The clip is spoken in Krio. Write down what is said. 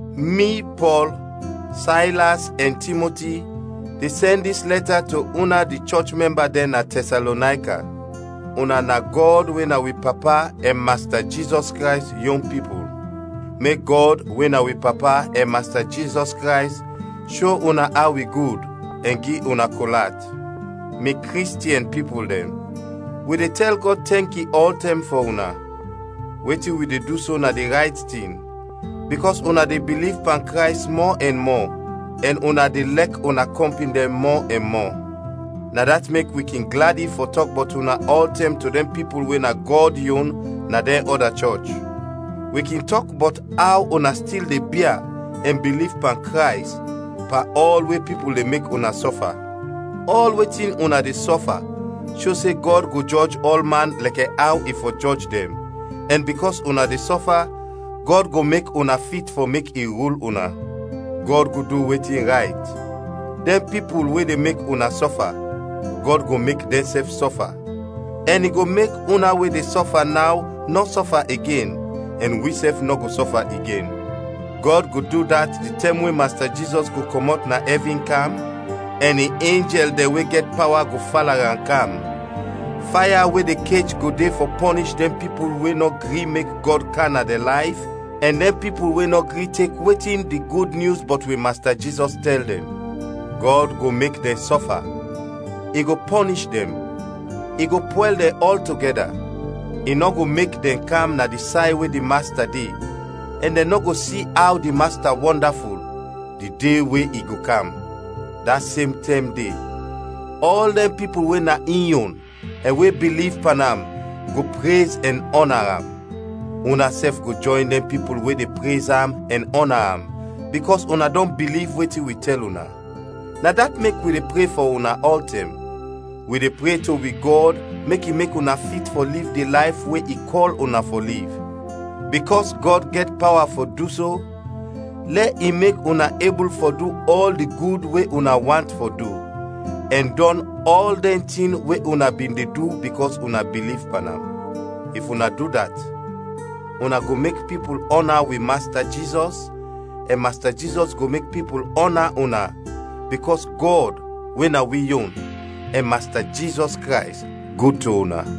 Mi, Pɔl, Saylas ɛn Timoti de sɛn dis lɛta to una di chɔch mɛmba dɛn na Tɛsalonayka; una na Gɔd we na wi Papa ɛn Masta Jizɔs Krays yon pipul. Mek Gɔd we na wi Papa ɛn Masta Jizɔs Krays sho una aw i gud ɛn gi una kol at. Mi Kristiɛn pipul dɛn, wi de tɛl Gɔd tɛnki ɔltɛm fɔ una. Wetin wi de du so na di rayt tin, bikɔs una de biliv pan Krays mɔ ɛn mɔ ɛn una de lɛk una kɔmpin dɛn mɔ ɛn mɔ. Na dat mek wi kin gladi fɔ tɔk bɔt una ɔltɛm to dɛn pipul we na Gɔd yon na dɛn ɔda chɔch. Wi kin tɔk bɔt aw una stil de bia ɛn biliv pan Krays, pan ɔl we pipul de mek una sɔfa. Ɔl wetin una de sɔfa sho se Gɔd go jɔj ɔlman lɛkɛ aw i fɔ jɔj dɛn, ɛn bikɔs una de sɔfa, Gɔd go mek una fit fɔ mek i rul una. Gɔd go du wetin rayt: dɛn pipul we de mek una sɔfa, Gɔd go mek dɛnsɛf sɔfa, ɛn i go mek una we de sɔfa naw nɔ sɔfa igen, ɛn wisɛf nɔ go sɔfa igen. Gɔd go du dat di tɛm we Masta Jizɔs go kɔmɔt na ɛvin kam ɛn in enjɛl dɛn we gɛt pawa go fala am kam, faya we de kech go de fɔ pɔnish dɛn pipul we nɔ gri mek Gɔd kam na dɛn layf ɛn dɛn pipul we nɔ gri tek wetin di Gud Nyus bɔt wi Masta Jizɔs tɛl dɛn. Gɔd go mek dɛn sɔfa; i go pɔnish dɛn, i go pwɛl dɛn ɔltogɛda. I nɔ go mek dɛn kam na di say we di Masta de, ɛn dɛn nɔ go si aw di Masta wɔndaful, di de we i go kam. Da sem tɛm de ɔl dɛn pipul we na in yon ɛn we biliv pan am go prez ɛn ɔna am. Unasɛf go jɔyn dɛn pipul we de prez am ɛn ɔna am, bikɔs una dɔn biliv wetin wi tɛl una. Na dat mek wi de pre fɔ una ɔltɛm. Wi de pre to wi Gɔd mek i mek una fit fɔ liv di layf we i kɔl una fɔ liv. Bikɔs Gɔd gɛt pawa fɔ du so, lɛ i mek una ebul fɔ du ɔl di gud we una want fɔ du, ɛn dɔn ɔl dɛn tin we una bin de du bikɔs una biliv pan am. If una du dat, una go mek pipul ɔna wi Masta Jizɔs, ɛn Masta Jizɔs go mek pipul ɔna una, bikɔs Gɔd, we na wi yon, ɛn Masta Jizɔs Krays gud to una.